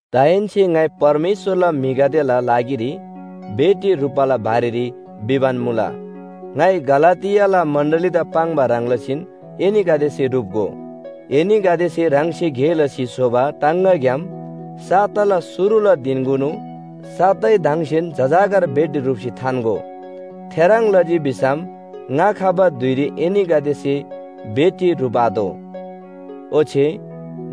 दाहेन्‍से ङाइ परमेश्‍वरला म्‍हिगदेला लागिरी भेटी ह्रुप्‍बाला बारेरी भिबान मुला, ङाइ गलातियाला मण्‍डलीदा पाङ्बा ह्रङ् लसीन एनीगदेसे ह्रुप्‍गो। एनीगदेसे ह्राङसे गे लसी स्‍होबा टाङगाग्‍याम साताला शुरुला धिनकुनु सा‍तैदङसेन जजाकर भेटी ह्रुप्‍सी थान्‍गो। थेह्रङ् लजी भिसम ङा खबा धुइरी एनीगदेसे भेटी ह्रुप आतोः। ओच्‍छे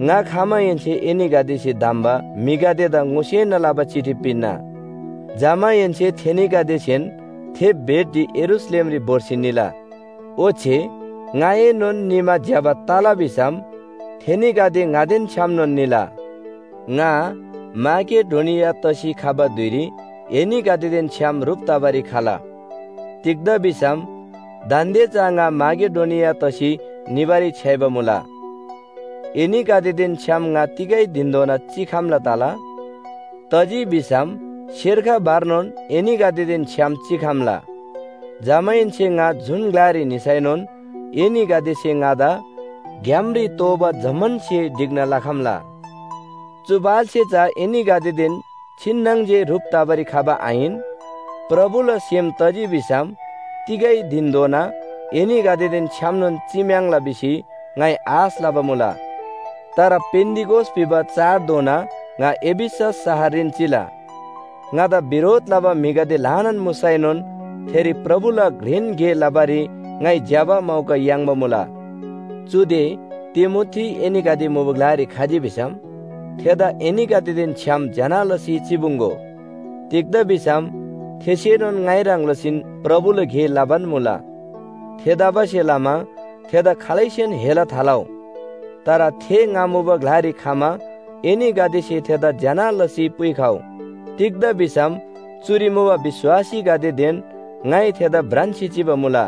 ङा खमाहेन्‍से एनीगदेसे धम्‍बा म्‍हिगदेदा ङोसेना लबा चिठी पिन्‍ना। जमाहेन्‍से थेनीगदेसेन थे भेटी यरूशलेमरी भोर्सी निला। ओच्‍छे ङाएनोन निमा ज्‍यबा तला भिसम थेनीगदे ङादेन छ्‌यामनोन निला। ङा माकेडोनिया तसी खबा धुइरी एनीगदेदेन छ्‌याम ह्रुप तबारी खला। तिग्‍दा भिसम दान्‍दे चा ङा माकेडोनिया तसी निबारी छ्‌याइबा मुला। एनीगदेदेन छ्‌याम ङा तिगै धिनधोना चिखम्‍ला तला, तजी भिसम सेर्ख भरनोन एनीगदेदेन छ्‌याम चिखम्‍ला। जमाहेन्‍से ङा जुन ग्‍लारी निसैनोन एनीगदेसे ङादा ग्‍यामरी तोःबा जम्‍मान स्‍हे ढिक्‍ना लखम्‍ला। चु पाल्‍से चा एनीगदेदेन छिन्‍नङ जे ह्रुप तबारी खबा आहिन, प्रभुला सेम तजी भिसम तिगै धिनधोना एनीगदेदेन छ्‌यामनोन चिम्‍याङ्ला भिसी ङाइ आश लबा मुला। तर पेन्‍तिकोस भिबा चाडधोना ङा एफिसस शहररीन चिला। ङादा बिरोध लबा म्‍हिगदे ल्‍हानान मुसैनोन थेरी प्रभुला घ्रेन गे लबारी ङाइ ज्‍यबा मौका याङ्बा मुला। चुदे तिमोथी एनीगदे मुबा ग्‍लारी खजी भिसम थेदा एनीगदेदेन छ्‌याम ज्‍यना लसी चिपुङ्‍गो। तिग्‍दा भिसम थेसेनोन ङाइ ह्रङ् लसीन प्रभुला गे लबान मुला। थेतबासेलमा थेदा खालैसेन हेला थालउ। तर थे ङा मुबा ग्‍लारी खमा एनीगदेसे थेदा ज्‍यना लसी पुइखउ। तिग्‍दा भिसम चुरी मुबा विश्‍वासीगदेदेन ङाइ थेदा भ्रान्‍सी चिबा मुला।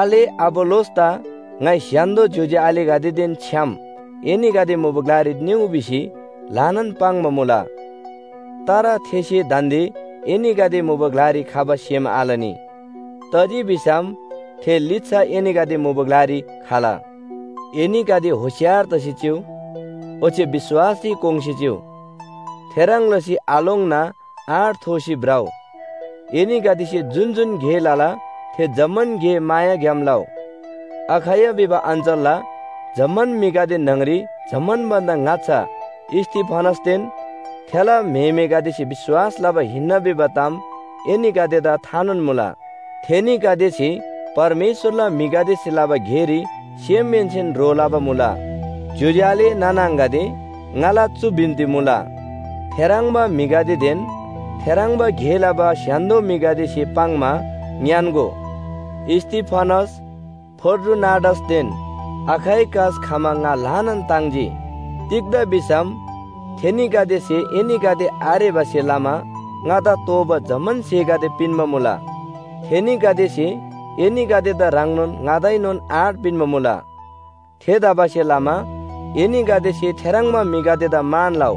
आले अपोल्‍लोसदा ङाइ स्‍य्‍हान्‍दो ज्‍योज्‍यो आलेगदेदेन छ्‌याम एनीगदे मुबा ग्‍लारी निउ भिसी ल्‍हानान पाङ्बा मुला। तर थेसे दान्‍दे एनीगदे मुबा ग्‍लारी खबा सेम आलनी, तजी भिसम थे लिच्‍छा एनीगदे मुबा ग्‍लारी खला। एनीगदे होशियार तसी चिउ। ओच्‍छे विश्‍वासरी कोङ्‌सी चिउ। थेह्रङ् लसी आलोङ्ना आँट थोसी भ्रउ। एनीगदेसे जुन जुन गे लला थे जम्‍मान गे मायाग्‍याम लउ। अखैया भिबा अञ्‍चलला जम्‍मान म्‍हिगदे न्‍हङरी जम्‍मान भन्‍दा ङाच्‍छा स्‍तिफनासदेन थेला म्‍हेमेगदेसे विश्‍वास लबा हिन्‍ना भिबा ताम एनीगदेदा थानोन मुला। थेनीगदेसे परमेश्‍वरला म्‍हिगदेसे लबा गेरी सेमहेन्‍सेन ह्रो लबा मुला। ज्‍योज्‍यो आले नाना आङागदे, ङाला चु बिन्‍ती मुला, थेह्रङ्बा म्‍हिगदेदेन थेह्रङ्बा गे लबा स्‍य्‍हान्‍दो म्‍हिगदेसे पाङ्‌मा ङ्‌यान्‍गो। स्‍तिफनास, फोर्टुनाटसदेन अखाइकस खमा ङा ल्‍हानान ताङ्जी। तिग्‍दा भिसम थेनीगदेसे एनीगदे आरेबासे लमा ङादा तोःबा जम्‍मान स्‍हेगदे पिन्‍बा मुला। थेनीगदेसे एनीगदेदा ह्रङ्नोन ङादाएनोन आँट पिन्‍बा मुला। थेतबासेलमा एनीगदेसे थेह्रङ्बा म्‍हिगदेदा मान लउ।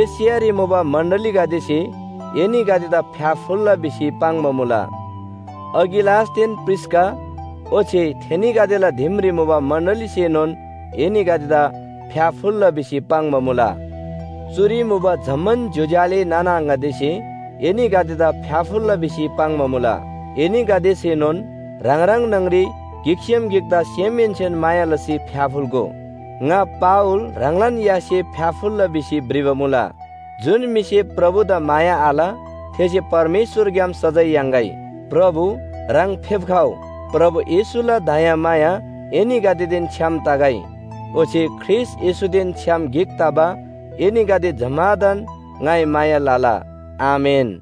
एशियारी मुबा मण्‍डलीगदेसे एनीगदेदा फ्‍याफुल्‍ला भिसी पाङ्बा मुला। अकिलासदेन प्रिस्‍का ओच्‍छे थेनीगदेला दिमरी मुबा मण्‍डलीसेनोन एनीगदेदा फ्‍याफुल्‍ला भिसी पाङ्बा मुला। चुरी मुबा जम्‍मान ज्‍योज्‍यो आले नाना आङागदेसे एनीगदेदा फ्‍याफुल्‍ला भिसी पाङ्बा मुला। एनीगदेसेनोन ह्राङ ह्राङ न्‍हङरी गिकसेम गिकदा सेमहेन्‍सेन माया लसी फ्‍याफुल्‍गो। ङा पावल ह्राङलान यासे फ्‍याफुल्‍ला भिसी भ्रिबा मुला। जुन म्‍हिसे प्रभुदा माया आल थेसे परमेश्‍वरग्‍याम सजाय याङ्‌गै। प्रभु, ह्राङ फेप्‍खउ! प्रभु येशूला दयामाया एनीगदेदेन छ्‌याम तगै। ओच्‍छे ख्रीष्‍ट येशूदेन छ्‌याम गिक तबा एनीगदे जम्‍मादान ङाइ माया लला, आमेन।